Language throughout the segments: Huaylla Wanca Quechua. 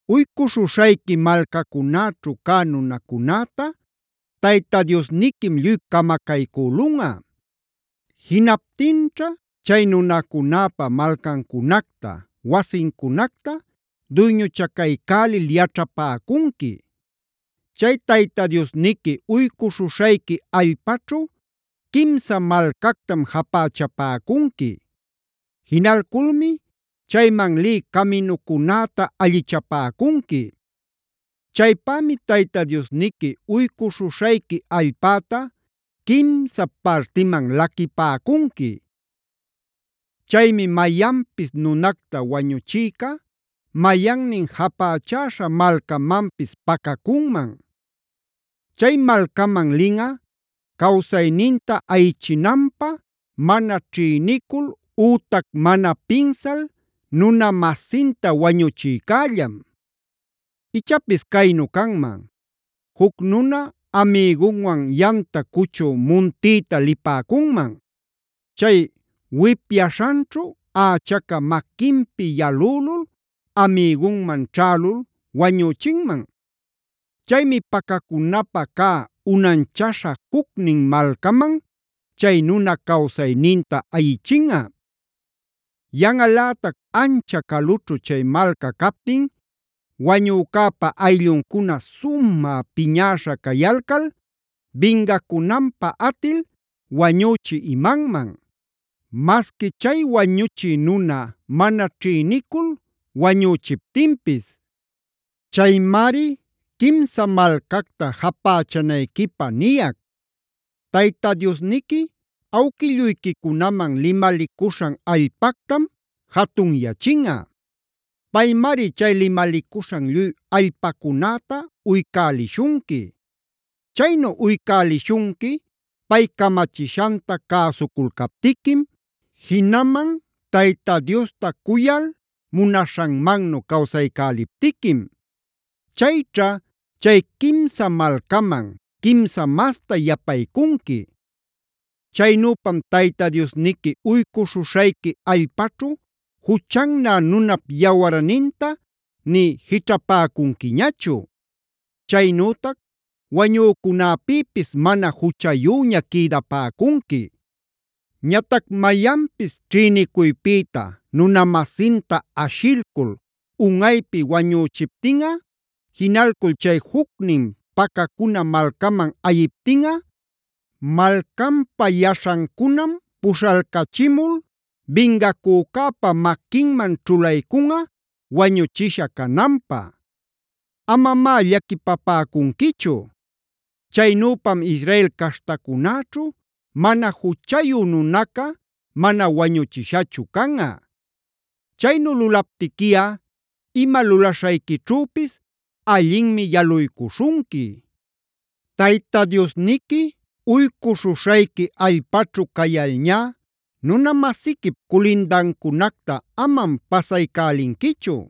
“Uycuśhuśhayqui malcacunäćhu cä nunacunäta Tayta Diosniquim lluy camacaycülunꞌa. Jinaptinćha chay nunacunäpa malcancunacta wasincunacta duyñuchacaycälil yaćhapäcunqui. Chay Tayta Diosniqui uycuśhuśhayqui allpaćhu quimsa malcactam japächapäcunqui.a Jinalculmi chayman lï caminucunäta allichapäcunqui. Chaypämi Tayta Diosniqui uycuśhuśhayqui allpäta quimsa partiman laquipäcunqui. Chaymi mayanpis nunacta wañuchïca mayannin japächäśha malcamanpis pacacunman. Chay malcaman linꞌa cawsayninta ayichinanpä mana ćhïnicul ütac mana pinsal nuna-masinta wañuchïcällam. Ichapis caynu canman: Juc nuna amïgunwan yamta cuchü muntïta lipäcunman. Chay wipyaśhanćhu ächaca maquinpi yalülul amïgunman ćhälul wañüchinman. Chaymi pacacunapä cä unanchaśha jucnin malcaman chay nuna cawsayninta ayichinꞌa. Yanꞌalätac ancha calućhu chay malca captin wañücäpa aylluncuna sumä piñäśha cayalcal bingacunanpä atil wañüchï imanman; masqui chay wañuchï nuna mana ćhïnicul wañüchiptinpis. Chaymari quimsa malcacta japächanayquipä niyac. Tayta Diosniqui awquilluyquicunaman limalicuśhan allpactam jatunyachinꞌa. Paymari chay limalicuśhan lluy allpacunäta uycälishunqui. Chaynu uycälishunqui pay camachishanta cäsuculcaptiquim, jinaman Tayta Diosta cuyal munaśhanmannu cawsaycäliptiquim. Chayćha chay quimsa malcaman, quimsa masta yapaycunqui. Chaynüpam Tayta Diosniqui uycuśhuśhayqui allpaćhu juchannä nunap yawarninta nï jićhapäcunquiñachu. Chaynütac wañücunäpïpis mana juchayüña quïdapäcunqui. “Ñatac mayanpis ćhïnicuypïta nuna-masinta ashilcul unꞌaypi wañüchiptinꞌa, jinalcul chay jucnin pacacuna malcaman ayiptinꞌa, malcanpa yaśhancunam puśhalcachimul bingacücäpa maquinman ćhulaycunꞌa wañuchisha cananpä. Amamá llaquipapäcunquichu. Chaynüpam Israel caśhtacunäćhu mana juchayu nunaca mana wañuchishachu canꞌa. Chaynu lulaptiquiꞌa ima lulaśhayquićhüpis allinmi yaluycuśhunqui. “Tayta Diosniqui uycuśhuśhayqui allpaćhu cayalcalñá nuna-masiquip culindancunacta amam pasaycälinquichu.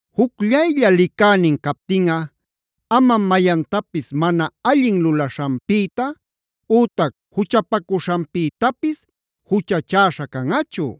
“Jucllaylla licänin captinꞌa amam mayantapis mana allin lulaśhanpïta ütac juchapacuśhanpïtapis juchachäśha canꞌachu.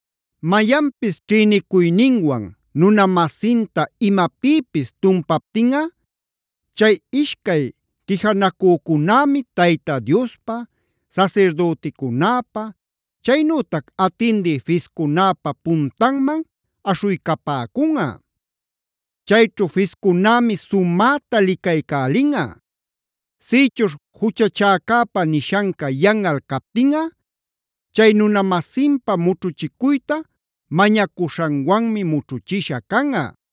“Mayanpis ćhïnicuyninwan nuna-masinta imapïpis tumpaptinꞌa, chay ishcay quijanacücunämi Tayta Diospa, sasirdüticunäpa, chaynütac atindï fiscunäpa puntanman aśhuycapäcunꞌa. Chayćhu fiscunämi sumäta licaycälinꞌa. Sïchuśh juchachäcäpa nishanca yanꞌal captinꞌa, chay nuna-masinpa mućhuchicuyta mañacuśhanwanmi mućhuchisha canꞌa.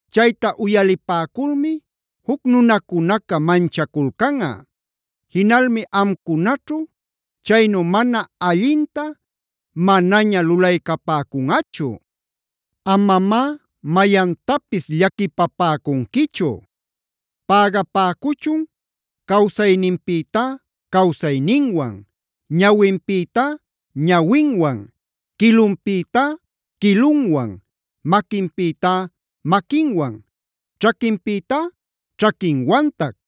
Chayta uyalipäculmi juc nunacunaca manchaculcanꞌa; jinalmi amcunaćhu chaynu mana allinta manaña lulaycäpäcunꞌachu. Amamá mayantapis llaquipapäcunquichu. Pägapäcuchun cawsayninpïtá cawsayninwan, ñawinpïtá ñawinwan, quilunpïtá quilunwan,e maquinpïtá maquinwan, ćhaquinpïtá ćhaquinwantac.